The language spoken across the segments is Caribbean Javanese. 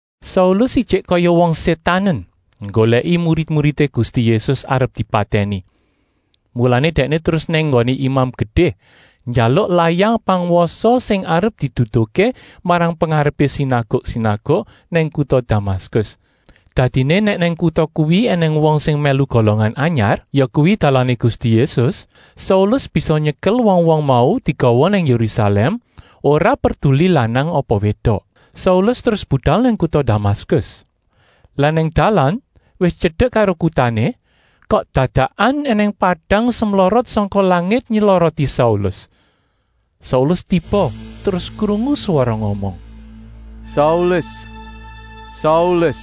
Saulus ijik kaya wong sétanen nggolèki murid-muridé Gusti Yésus arep dipatèni. Mulané dèkné terus nang nggoné Imam Gedé njaluk layang pangwasa sing arep diduduhké marang pengarepé sinaguk-sinaguk nang kuta Damaskus. Dadiné nèk nang kuta kuwi ènèng wong sing mèlu “Golongan Anyar,” yakuwi dalané Gusti Yésus, Saulus bisa nyekel wong-wong mau digawa nang Yérusalèm, ora perduli lanang apa wédok. Saulus terus budal nang kuta Damaskus. Lah nang dalan, wis tyedek karo kutané, kok dadakan ènèng padang semlorot sangka langit nyloroti Saulus. Saulus tiba terus krungu swara ngomong: “Saulus, Saulus!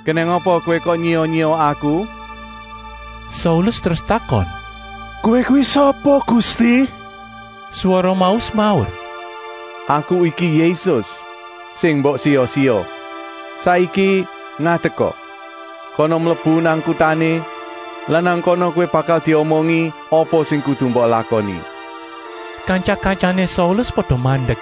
Kenèng apa kowé kok nyiya-nyiya Aku!” Saulus terus takon: “Kowé kuwi sapa Gusti?” Swara mau semaur: “Aku iki Yésus sing mbok siya-siya. Saiki ngadeka! Kana mlebu nang kutané lan nang kana kowé bakal diomongi apa sing kudu mbok lakoni.” Kantya-kantyané Saulus pada mandek,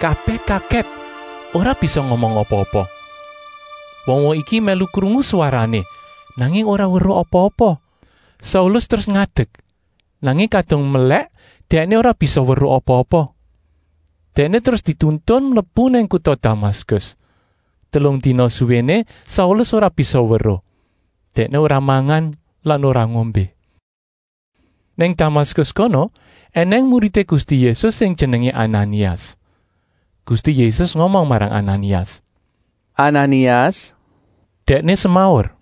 kabèh kagèt ora bisa ngomong apa-apa. Wong-wong iki mèlu krungu swarané, nanging ora weruh apa-apa. Saulus terus ngadek, nanging kadung melèk dèkné ora bisa weruh apa-apa. Dèkné terus dituntun mlebu nang kuta Damaskus. Telung dina suwéné Saulus ora bisa weruh, dèkné ora mangan lan ora ngombé. Nang Damaskus kono ènèng muridé Gusti Yésus sing jenengé Ananias. Gusti Yésus ngomong marang Ananias: “Ananias!” Dèkné semaur: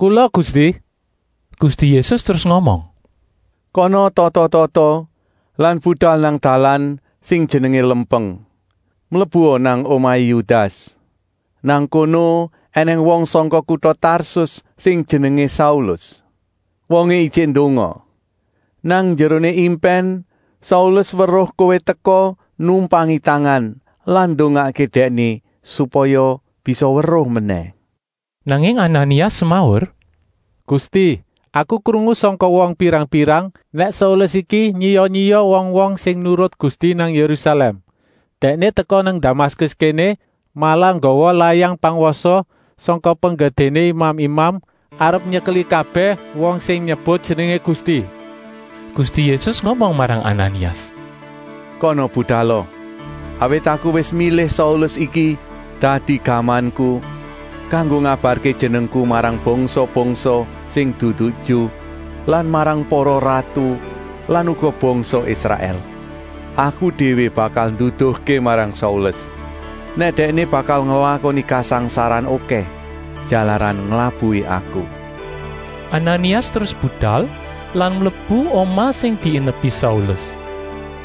“Kula Gusti!” Gusti Yésus terus ngomong: “Kana tata-tata lan budal nang dalan sing jenengé ‘Lempeng’. Mlebua nang omahé Yudas. Nang kono ènèng wong sangka kuta Tarsus sing jenengé Saulus. Wongé ijik ndonga. Nang njeroné impèn Saulus weruh kowé teka numpangi tangan lan ndongakké dèkné supaya bisa weruh menèh!” Nanging Ananias semaur: “Gusti, aku krungu sangka wong pirang-pirang nèk Saulus iki nyiya-nyiya wong-wong sing nurut Gusti nang Yérusalèm. Dèkné teka nang Damaskus kéné malah nggawa layang pangwasa sangka penggedéné imam-imam, arep nyekeli kabèh wong sing nyebut jenengé Gusti!” Gusti Yésus ngomong marang Ananias: “Kana budala, awit Aku wis milih Saulus iki dadi gamanku kanggo ngabarké jenengku marang bangsa-bangsa sing dudu Ju lan marang para ratu lan uga bangsa Israèl. Aku déwé bakal nduduhké marang Saulus, nèk dèkné bakal nglakoni kasangsaran okèh jalaran nglabuhi Aku.” Ananias terus budal lan mlebu omah sing diinepi Saulus.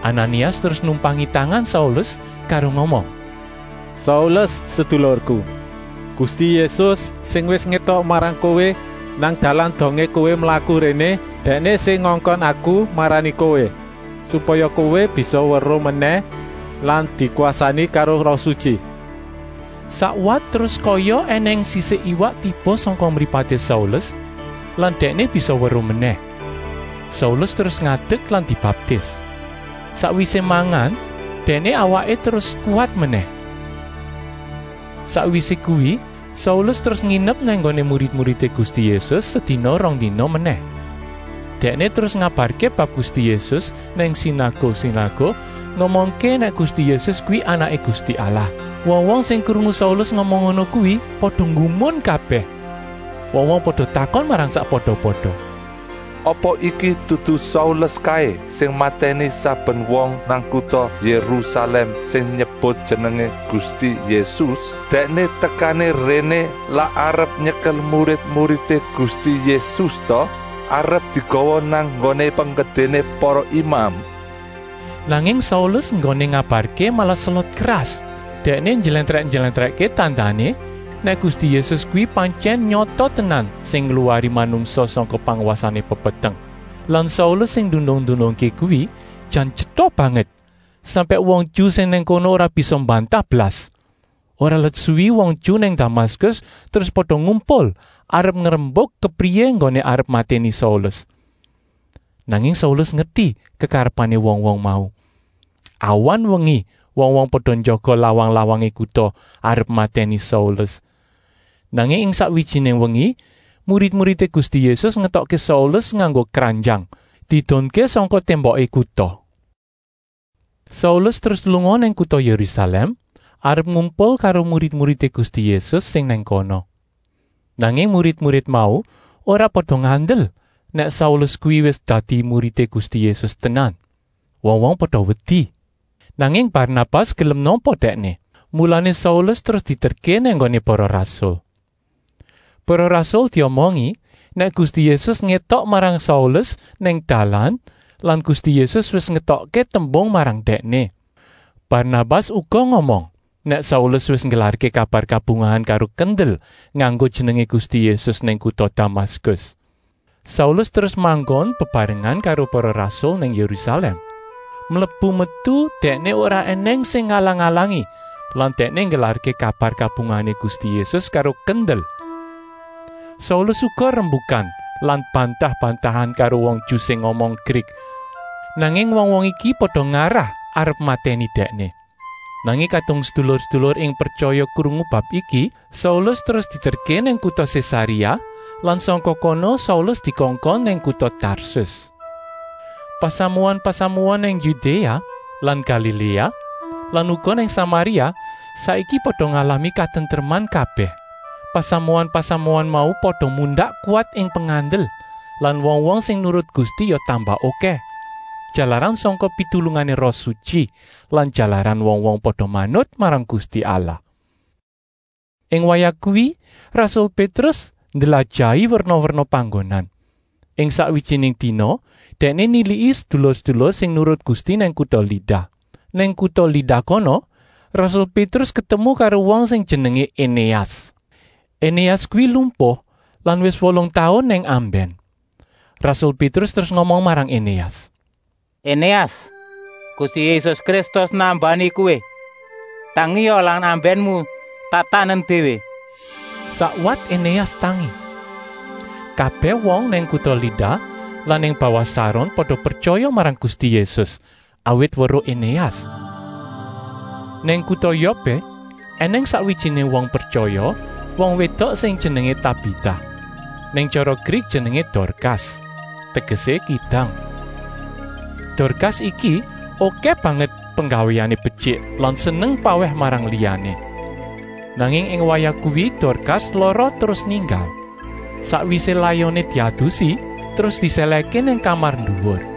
Ananias terus numpangi tangan Saulus karo ngomong: “Saulus sedulurku, Gusti Yésus sing wis ngétok marang kowé nang dalan dongé kowé mlaku réné, Dèkné sing ngongkon aku marani kowé, supaya kowé bisa weruh menèh lan dikwasani karo Roh Sutyi.” Sakwat terus kaya ènèng sisik iwak tiba sangka mripaté Saulus lan dèkné bisa weruh menèh. Saulus terus ngadek lan dibaptis. Sakwisé mangan dèkné awaké terus kuwat menèh. Sakwisé kuwi Saulus terus nginep nang nggoné murid-muridé Gusti Yésus sedina-rongdina menèh. Dèkné terus ngabarké bab Gusti Yésus nang sinaguk-sinaguk, ngomongké nèk Gusti Yésus kuwi Anaké Gusti Allah. Wong-wong sing krungu Saulus ngomong ngono kuwi pada nggumun kabèh. Wong-wong pada takon marang sakpada-pada: “Apa iki dudu Saulus kaé sing matèni saben wong nang kuta Yérusalèm sing nyebut jenengé Gusti Yésus? Dèkné tekané réné lak arep nyekel murid-muridé Gusti Yésus ta, arep digawa nang nggoné penggedéné para imam?” Nanging Saulus enggoné ngabarké malah selot keras. Dèkné njlèntrèk-njlèntrèkké tandané nèk Gusti Yésus kuwi pantyèn nyata tenan sing ngluwari manungsa sangka pangwasané pepeteng. Lan Saulus sing ndunung-ndunungké kuwi jan tyeta banget, sampèk wong Ju sing nang kono ora bisa mbantah blas. Ora let suwi wong Ju nang Damaskus terus pada ngumpul arep ngrembuk kepriyé enggoné arep matèni Saulus. Nanging Saulus ngerti kekarepané wong-wong mau. Awan-wengi wong-wong pada njaga lawang-lawangé kuta arep matèni Saulus. Nanging ing sakwijiné wengi murid-muridé Gusti Yésus ngetokké Saulus nganggo kranjang, diedunké sangka témboké kuta. Saulus terus lunga nang kuta Yérusalèm arep ngumpul karo murid-muridé Gusti Yésus sing nang kono. Nanging murid-murid mau ora pada ngandel nèk Saulus kuwi wis dadi muridé Gusti Yésus tenan. Wong-wong pada wedi. Nanging Barnabas gelem nampa dèkné, mulané Saulus terus dieterké nang nggoné para rasul. Para rasul diomongi nèk Gusti Yésus ngétok marang Saulus nang dalan lan Gusti Yésus wis ngetokké tembung marang dèkné. Barnabas uga ngomong nèk Saulus wis nggelarké kabar kabungahan karo kendel nganggo jenengé Gusti Yésus nang kuta Damaskus. Saulus terus manggon bebarengan karo para rasul nang Yérusalèm. Mlebu-metu dèkné ora ènèng sing ngalang-alangi lan dèkné nggelarké kabar kabungahané Gusti Yésus karo kendel. Saulus uga rembukan lan bantah-bantahan karo wong Ju sing ngomong Grik. Nanging wong-wong iki pada ngarah arep matèni dèkné. Nanging kadung sedulur-sedulur ing pretyaya krungu bab iki, Saulus terus dieterké nang kuta Sésaréa lan sangka kono Saulus dikongkon nang kuta Tarsus. Pasamuan-pasamuan nang Yudéa lan Galiléa lan uga nang Samaria saiki pada ngalami katentreman kabèh. Pasamuan-pasamuan mau pada mundak kuwat ing pengandel lan wong-wong sing nurut Gusti ya tambah okèh, jalaran sangka pitulungané Roh Sutyi lan jalaran wong-wong pada manut marang Gusti Allah. Ing wayah kuwi rasul Pétrus ndlajahi werna-werna panggonan. Ing sakwijiné dina dèkné niliki sedulur-sedulur sing nurut Gusti nang kuta Lida. Nang kuta Lida kono rasul Pétrus ketemu karo wong sing jenengé Enéas. Enéas kuwi lumpuh lan wis wolung taun nang ambèn. Rasul Pétrus terus ngomong marang Enéas: “Enéas, Gusti Yésus Kristus nambani kowé! Tangia lan ambènmu tatanen déwé!” Sakwat Enéas tangi. Kabèh wong nang kuta Lida lan nang bawah Saron pada pretyaya marang Gusti Yésus, awit weruh Enéas. Nang kuta Yopé ènèng sakwijiné wong pretyaya, wong wédok sing jenengé Tabita. Nèk tyara Grik jenengé Dorkas, tegesé Kidang. Dorkas iki okèh banget penggawéné betyik lan seneng pawèh marang liyané. Nanging ing wayah kuwi Dorkas lara terus ninggal. Sakwisé layoné diadusi terus disèlèhké nang kamar nduwur.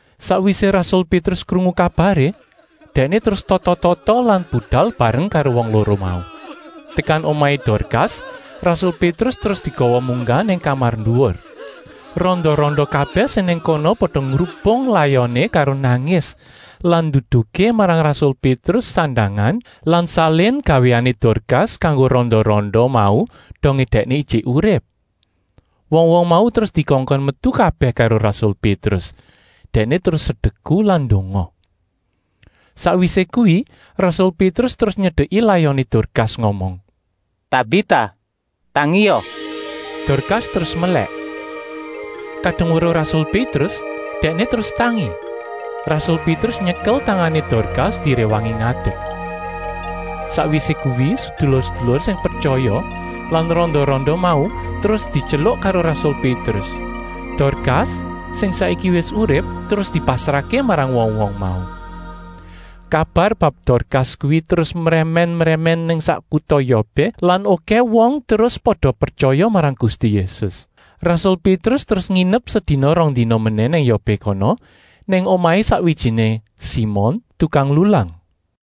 Sakwisé rasul Pétrus krungu kabaré, dèkné terus tata-tata lan budal bareng karo wong loro mau. Tekan omahé Dorkas rasul Pétrus terus digawa munggah nang kamar nduwur. Randa-randa kabèh sing nang kono pada ngrubung layoné karo nangis lan nduduhké marang rasul Pétrus sandangan lan salin gawéané Dorkas kanggo randa-randa mau dongé dèkné ijik urip. Wong-wong mau terus dikongkon metu kabèh karo rasul Pétrus, dèkné terus sedeku lan ndonga. Sakwisé kuwi rasul Pétrus terus nyedeki layoné Dorkas ngomong: “Tabita, tangia!” Dorkas terus melèk. Kadung weruh rasul Pétrus dèkné terus tangi. Rasul Pétrus nyekel tangané Dorkas diréwangi ngadek. Sakwisé kuwi sedulur-sedulur sing pretyaya lan randa-randa mau terus dityeluk karo rasul Pétrus. Dorkas, sing saiki wis urip, terus dipasrahké marang wong-wong mau. Kabar bab Dorkas kuwi terus mrèmèn-mrèmèn nang sak kuta Yopé lan okèh wong terus pada pretyaya marang Gusti Yésus. Rasul Pétrus terus nginep sedina-rongdina menèh nang Yopé kono nang omahé sakwijiné Simon, tukang lulang.